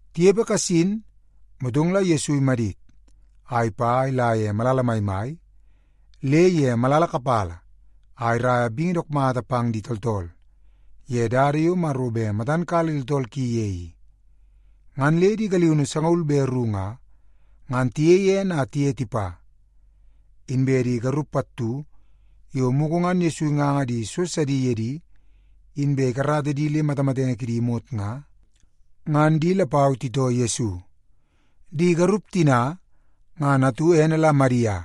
Tinepe kasin, motong la Yesu imadit a ipa a ila ye malala maimai le ye malala kapala a iraia bingi dook mata pang di tooltool ye dada yo Maro bet matan kala di tooltool ki ye i. Ngan le di galiunu sangaul be ru nga, ngan tiyei ene a tiye tipa. Inbe di garup pattu yo mugu ngan Yesu inganga di so sidi ye di inbe ikarata di le matamatenge kidi imot nga, ngan di lapau titoo Yesu. Di garup tina ngan atu ene la Madia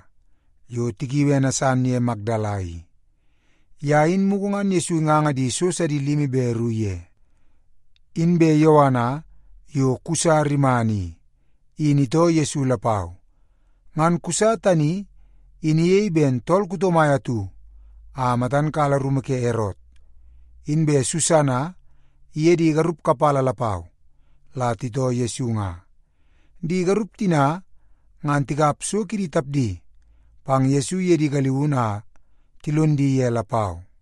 yo tikiui ene san ye Makdala i. Ye in mugu ngan Yesu inganga di so sidi limi be ru ye. Inbe Yoana yo Kusa rimana i, in itoo Yesu lapau. Ngan Kusa tani in iyei ben tool kuto mai atu a matan kala rumu ke Erot. Inbe Susana iye di garup kapala lapau la titoo Yesu nga. Di garup tina ngan tikap so kidi tapdi pang Yesu iye di galiunu a tilon di ye lapau.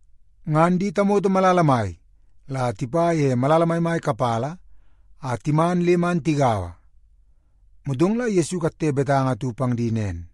Ngan di tamoto malala mai la tipa ye malala maimai kapala a timan le man tigaua. Motong la Yesu ikatte betanga atu pang di nen,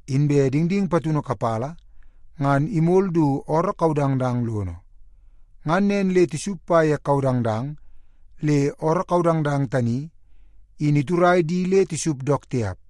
Inbe dingding patunu kapala ngan imol du ooroo kaudangdang lono. Ngan nen le tisup pa ye kaudangdang le ooroo kaudangdang tani in iturai di le tisup dook tiap.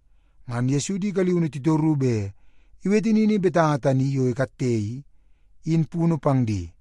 Ngan Yesu di galiunu titoru bet iwete nini betanga tani yo ikatte i, in punu pang di.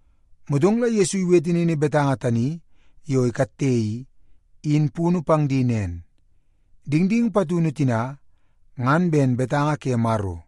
Motong la Yesu iwete nini betanga tani yo ikatte i, in punu pang di nen, “Dingding patunu tina, ngan ben betanga ke Maro.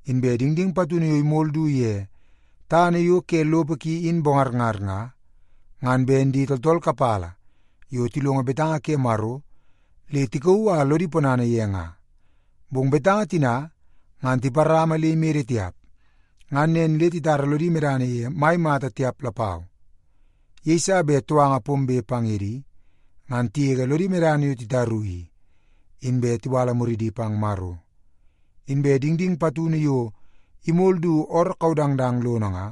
Inbe dingding patunu yo imol du ye tana yo ke lopo ki in bongarngar nga, ngan ben di tooltool kapala yo tilongo betanga ke Maro le tikauu a lodi ponana ye nga. Bong betanga tina ngan tiparama le imede tiap, ngan nen le titara lodi medana ye mai mata tiap lapau. Yeiso bet touanga pombe pang ye di ngan tigege lodi medana yo titaru i, inbe tiwala muridi pang Maro. Inbe dingding patunu yo imol du ooroo kaudangdang lono nga,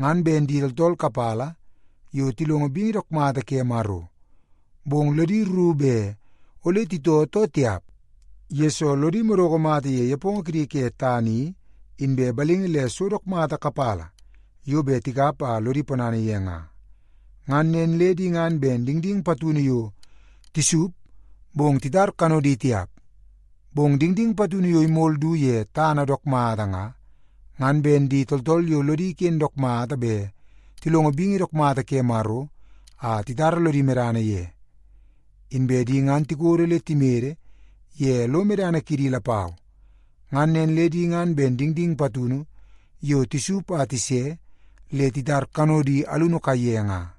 ngan ben di tooltool kapala yo tilongo bingi dook mata ke Maro. Bong lodi rru bet ole titoo too tiap, yesoo lodi madoko mata ye nepongo kidi ke tana i, inbe balingi le so dook mata kapala yo bet tikap a lodi ponana ye nga. Ngan nen le di ngan ben dingding patunu yo tisup bong titar kanodi tiap nga. Bong dingding patunu yo imol du ye tana dook mata nga, ngan ben di tooltool yo lodi ken dook mata bet tilongo bingi dook mata ke Maro a titara lodi medana ye. Inbe di ngan tikodo le timede ye lo medana kidi lapau. Ngan nen le di ngan ben dingding patunu yo tisup a tise le titar kanodi alunu kaiye nga.”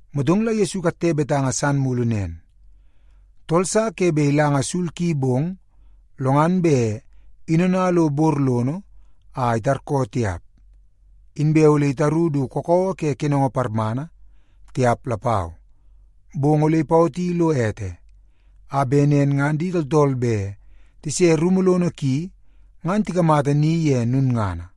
Motong la Yesu ikatte betanga san mulu nen, “Tool sa ke bet ilanga sul ki bong, lo ngan bet inona lo bor lono a itarkoo tiap. Inbe ole itaru du kakawa ke kenongo parmana, tiap lapau. Bong ole ipawoti lo ete, a bet nen ngan di tooltool bet tise rumu lono ki ngan tikamata ni ye lulngana.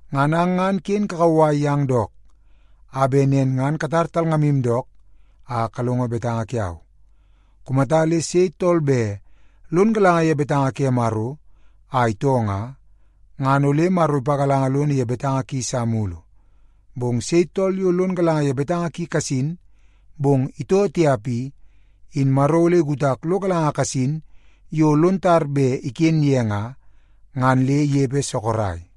Ngan ang ngan ken kakauwai yang dook a bet nen ngan katar talngamu dook a kalongo betanga kiau. Kumata le sei tool bet lon galanga ye betanga ke Maro a itoo nga, ngan ole Maro ipagalanga lono ye betanga ki sa mulu. Bong sei tool yo lon galanga ye betanga ki kasin, bong itoo tiap i, in Maro ole ikutak lo galanga kasin yo lon tar bet iken ye nga, ngan le inepe sorok.”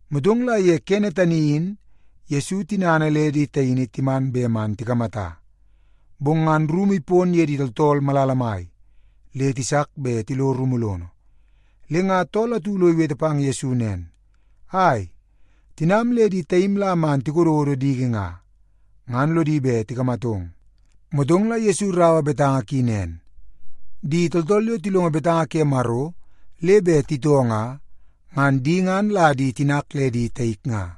Motong la ye kene tani in Yesu tinana le di taini timan bet man tikamata. Bong ngan rumu ipon ye di tooltool malala mai, le tisak bet tilo rumu lono. Le nga tool atu lo iwete pang Yesu nen, “Ai, tinam le di taim la man tikododo diki nga, ngan lodi bet tikamatong.” Motong la Yesu iraua betanga ki nen, “Di tooltool yo tilongo betanga ke Maro le bet titoo nga, ngan di ngan la di tinak le di taik nga.”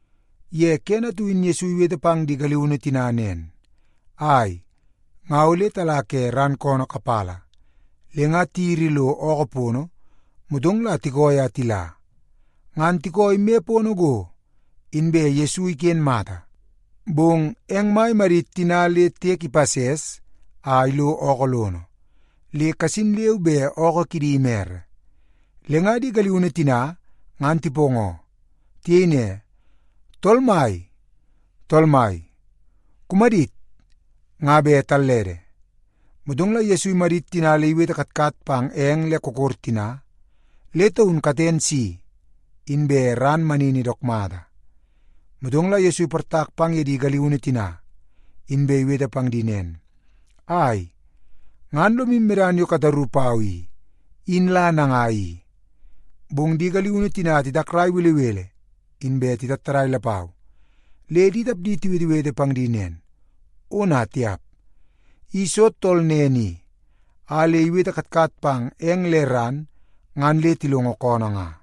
Ye kene atu in Yesu iwete pang di galiunu tina nen, “Ai, nga ole tala ke ran koonoo kapala.” Le nga tiyiri lo ookoo pono, motong la tikooi a tila. Ngan tikooi me pono go, inbe Yesu iken mata. Bong eng mai imadit tina le tiek ipases a ilo ookoo lono, le kasin leu be ookoo kidi imere. Le nga di galiunu tina ngan tipoongoo. Tiyei ne, “Tool mai, tool mai, kumadit! Nga bet tallede!” Motong la Yesu imadit tina le iwete katkat pang eng le kokor tina, le taun katen si, inbe ran manini dook mata. Motong la Yesu iportak pang ye di galiunu tina, inbe iwete pang di nen, “Ai, ngan lomu medana yo bet kataru pau i, in la nangai i?” Bong di galiunu tina titakrai belebele, inbe tatattadai lapau, le di tapdi tiwetewete pang di nen, “Ona tiap! I soo tool nen i a le iwete katkat pang eng le ran ngan le tilongo koonoo nga?”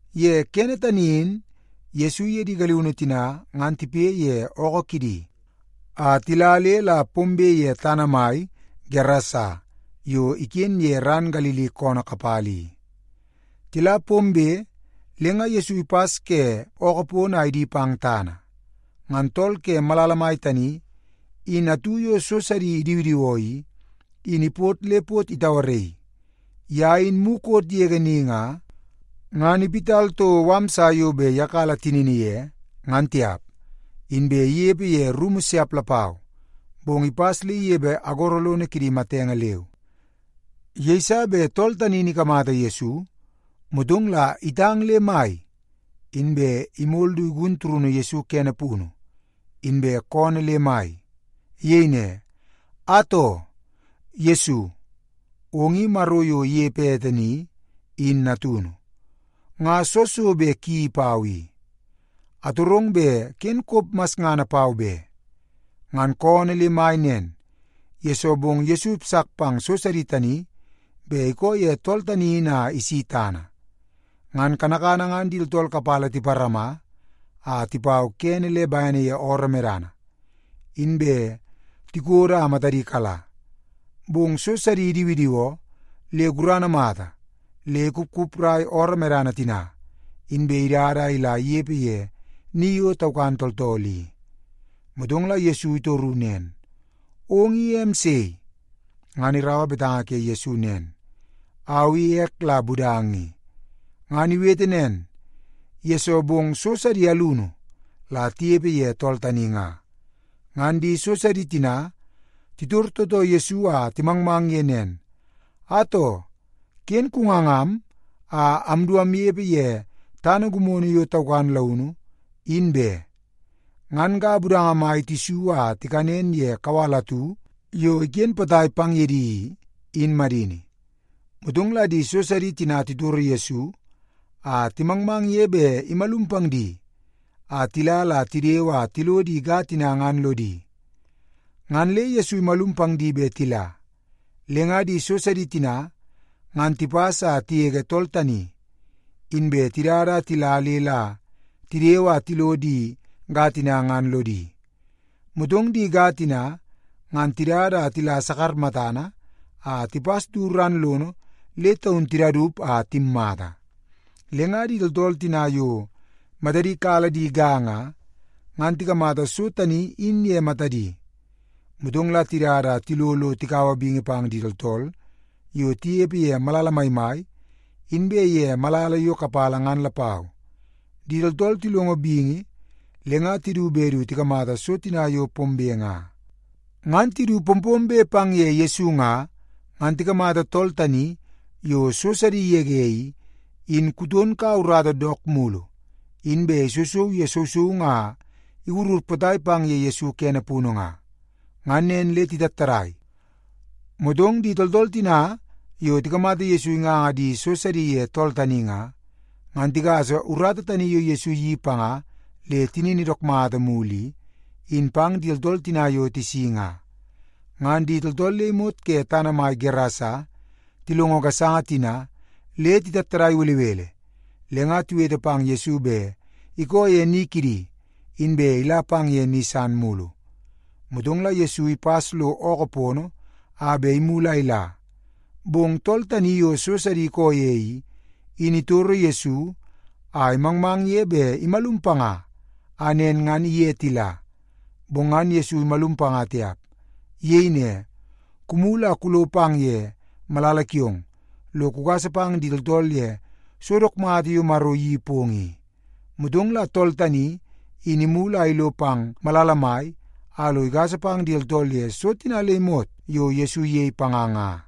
Ye kene tani in Yesu iye di galiunu tina ngan tipoi ye ookoo kidi a tila le la pombe ye tana mai kidi tooltool ke Gerasa yo iken ke ran Galili koonoo kapala i. Tila pombe, le nga Yesu ipas ke ookoo pono a idi pang tana, ngan tool ke malala mai tani in atu yo so sidi idiwidiwoo i, in ipot le pot itauaraii. Ye in mukot yege ni nga, ngan iwit toko mala sa yo bet iyakala tinini ye, ngan tiap. Inbe inepe ye rumu siap lapau, bong ipas le inepe agoro lono kidi matenge leu. Yeiso bet tool tani in ikamata Yesu, motong la itang le mai, inbe imol du igun turunu Yesu kene punu, inbe koonoo le mai. Iyei ne, “Atoo! Yesu, ong i Maro yo inepe ete ni, in natunu. Nga soo so bet kuyeii pau i? Atorong bet ken kop masngana pau be!” Ngan koonoo le mai nen, yesoo bong Yesu ipasak pang so sidi tani bet ikoo ye tool tani in a isi tana. Ngan kanakana ngan di tooltool kapala tiparama a tipau kene le bene ye ooroo medana, inbe tikodo a matadi kala. Bong so sidi idiwidiwoo le gurana mata le ikupkuprai ooroo medana tina, inbe idada a ila inepe ye ni yo taukan tooltool i. Motong la Yesu itoru nen, “Ong i em sei?” Ngan iraua betanga ke Yesu nen, “Au i ek la Budanga i.” Ngan iwete nen, yesoo bong so sidi alunu la tinepe ye tool tani nga. Ngan di so sidi tina titor tootoo Yesu a timangmang ye nen, “Atoo, ken kungangam a amdu amnepe ye tana gimono yo taukan launu, in be.” Ngan ga budanga mai tisu a tikanen ye kawal atu yo iken potai pang ye di i, in madini. Motong la di so sidi tina titoro Yesu a timangmang ye bet imalum pang di a tila la tidewe a tilo di ga tina ngan lodi. Ngan le Yesu imalum pang di bet tila. Le nga di so sidi tina ngan tipas a tigege tool tani, inbe tidada a tila le la tidewe a tilo di ga tina ngan lodi. Motong di ga tina ngan tidada a tila sakar matana a tipas du ran lono le taun tidaup a timmata. Le nga di tooltool tina yo matadi kala di ga nga, ngan tikamata so tani in ye matadi. Motong la tidada a tilo lo tikaua bingi pang di tooltool yo tinepe ye malala maimai inbe ye malala yo kapala ngan lapau. Di tooltool tilongo bingi, le nga tidu bet du tikamata so tina yo pombe nga. Ngan tidu pompombe pang ye Yesu nga, ngan tikamata tool tani yo so sidi igege i, in kuton kaua urata dook mulu, inbe isousou ye sousoungu a iwurur potai pang ye Yesu kene punu nga. Ngan nen le titattadai. Motong di tooltool tina yo tikamata Yesu inganga di so sidi ye tool tani nga, ngan tigasa urata tani yo Yesu iyeii panga le tinini dook mata mulu i, in pang di tooltool tina yo tisi nga. Ngan di tooltool le imot ke tana mai Gerasa tilongo gasanga tina le titattadai belebele, le nga tiwete pang Yesu bet ikoo ye ni kidi, inbe ila pang ye ni san mulu. Motong la Yesu ipas lo ookoo pono a bet imulu a ila. Bong tool tani yo so sidi ikoo ye i, in itoro Yesu a imangmang ye bet imalum panga a nen ngan iye tila. Bong ngan Yesu imalum panga tiap. Iyei ne, “Kumulu a kulo pang ye malala kiong, lo kugasa pang di tooltool ye so dook mata yo Maro iyeii pong i.” Motong la tool tani, in imulu a ilo pang malala mai a lo igasa pang di tooltool ye so tina le imot yo Yesu iyei panga nga.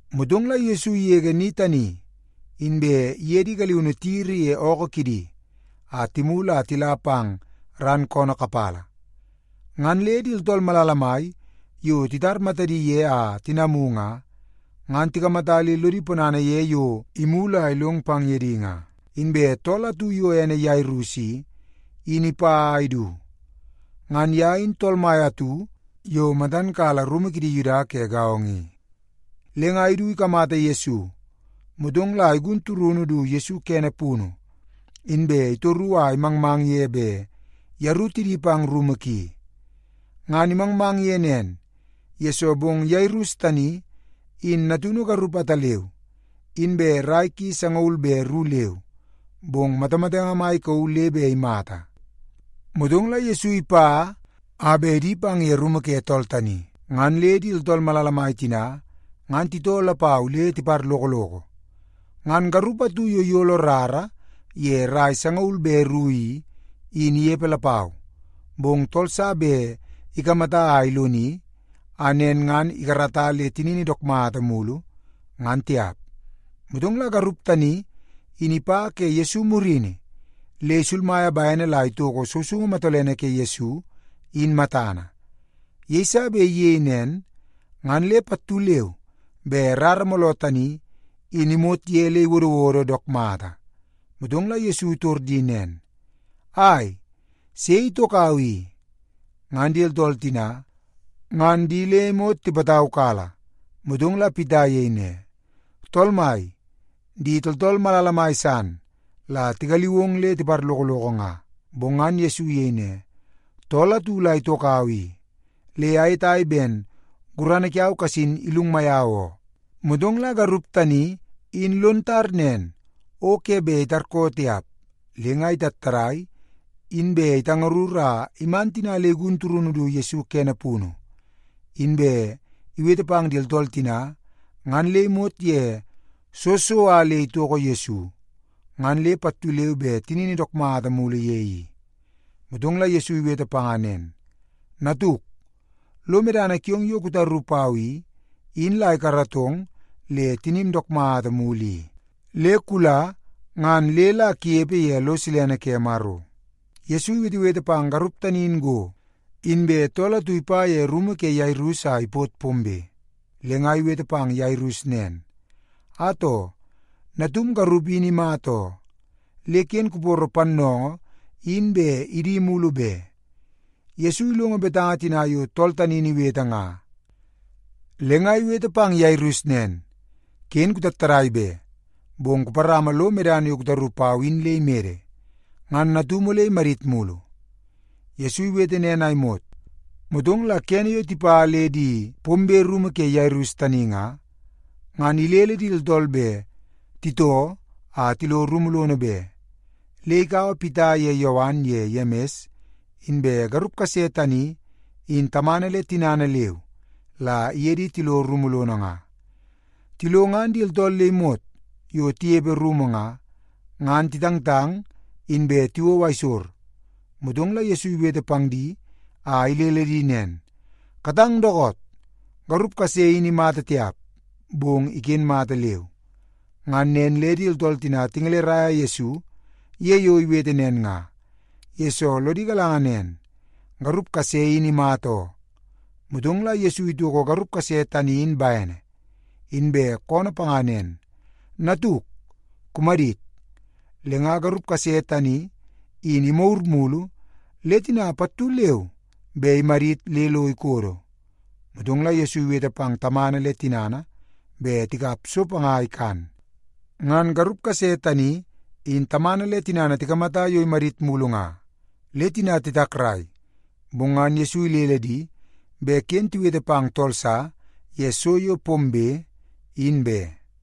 Motong la Yesu igege ni tani, inbe iye di galiunu tiyiri ye ookoo kidi a timulu a tila pang ran koonoo kapala. Ngan le di tooltool malala mai yo titar matadi ye a tinamu nga, ngan tikamata le lodi ponana ye yo imulu a ilong pang ye di nga. Inbe tool atu yo ene Yairus i, in ipa a idu. Ngan ye in tool mai atu yo matan kala rumu kidi Yuda ke gaongo i. Le nga idu ikamata Yesu, motong la igun turunu du Yesu kene punu, inbe itoru a imangmang ye bet yeru tidi pang rumu ki. Ngan imangmang ye nen, yesoo bong Yairus tani in natunu garup ataleu, inbe rai ki sangaul be ru leu, bong matamatenge mai ikauu le bet imata. Motong la Yesu ipa a bet idi pang ye rumu ke tool tani, ngan le di tooltool malala mai tina ngan titoo lapau le tiparlokoloko. Ngan garup atu yo iyolo rara ye rai sangaul be ru i, in inepe lapau. Bong tool sa bet ikamata a iloni, a nen ngan ikarata le tinini dook mata mulu, ngan tiap. Motong la garup tani in ipa ke Yesu murini le isulmaia bene la itoko sousoungu matolene ke Yesu, in matana. Yeiso bet iyei nen, ngan le pattu leu be rara mooloo tani in imot ye le iwodowodo dook mata. Motong la Yesu itor di nen, “Ai, sei itokau i?” Ngan di tooltool tina ngan di le imot tipataukala, motong la Pita iyei ne, “Tool mai, di tooltool malala mai san la tigaliu ong le tiparlokoloko nga.” Bong ngan Yesu iyei ne, “Tool atu la itokau i, le ayetai ben gurana kiau kasin ilungmai au oo.” Motong la garup tani in lon tar nen o ke bet itarkoo tiap. Le nga itattadai, inbe itangarur a iman tina le igun turunu du Yesu kene punu, inbe iwete pang di tooltool tina ngan le imot ye soo so a le itoko Yesu, ngan le pattu leu be tinini dook mata mulu ye i. Motong la Yesu iwete panga nen, “Natuk, lo medana kiong yo kutaru pau i, in la ikaratong le tinim dook mata mulu i. Le kula ngan le la kunepe ye lo silene ke Maro.” Yesu iwetewete pang garup tani in go, inbe tool atu ipa ye rumu ke Yairus a ipot pombe. Le nga iwete pang Yairus nen, “Atoo, natum garup in imata oo. Le ken kuporo pannoongoo in bet idi mulu be.” Yesu ilongo betanga tina yo tool tani in iwete nga, le nga iwete pang Yairus nen, “Ken kutattadai be, bong kuparama lo medana yo kutaru pau in le imede, ngan natum ole imadit mulu.” Yesu iwete nen a imot, motong la kene yo tipa le di pombe rumu ke Yairus tani nga, ngan ilele di tooltool bet titoo a tilo rumu lono be. Le ikaua Pita ye Yowan ye Yemis inbe garup kase tani in tamana le tinana leu, la iye di tilo rumu lono nga. Tilo ngan di tooltool le imot yo tinepe rumu nga, ngan titangtang inbe tiwou aisor. Motong la Yesu iwete pang di a ilele di nen, “Katang dookoot! Garup kase in imata tiap, bong iken mata leu.” Ngan nen le di tooltool tina tingeleraia Yesu ye yo iwete nen nga, yesoo lodi galanga nen, garup kase in imata oo. Motong la Yesu itoko garup kase tani in bene, inbe koonoo panga nen, “Natuk, kumadit.” Le nga garup kase tani in imagur mulu le tina pattu leu be imadit le lo ikodo. Motong la Yesu iwete pang tamana le tinana bet tikap so panga a ikan. Ngan garup kase tani in tamana le tinana tikamata yo imadit mulu nga, le tina titakrai. Bong ngan Yesu ilele di bet ken tiwete pang tool sa ye so yo pombe, in be.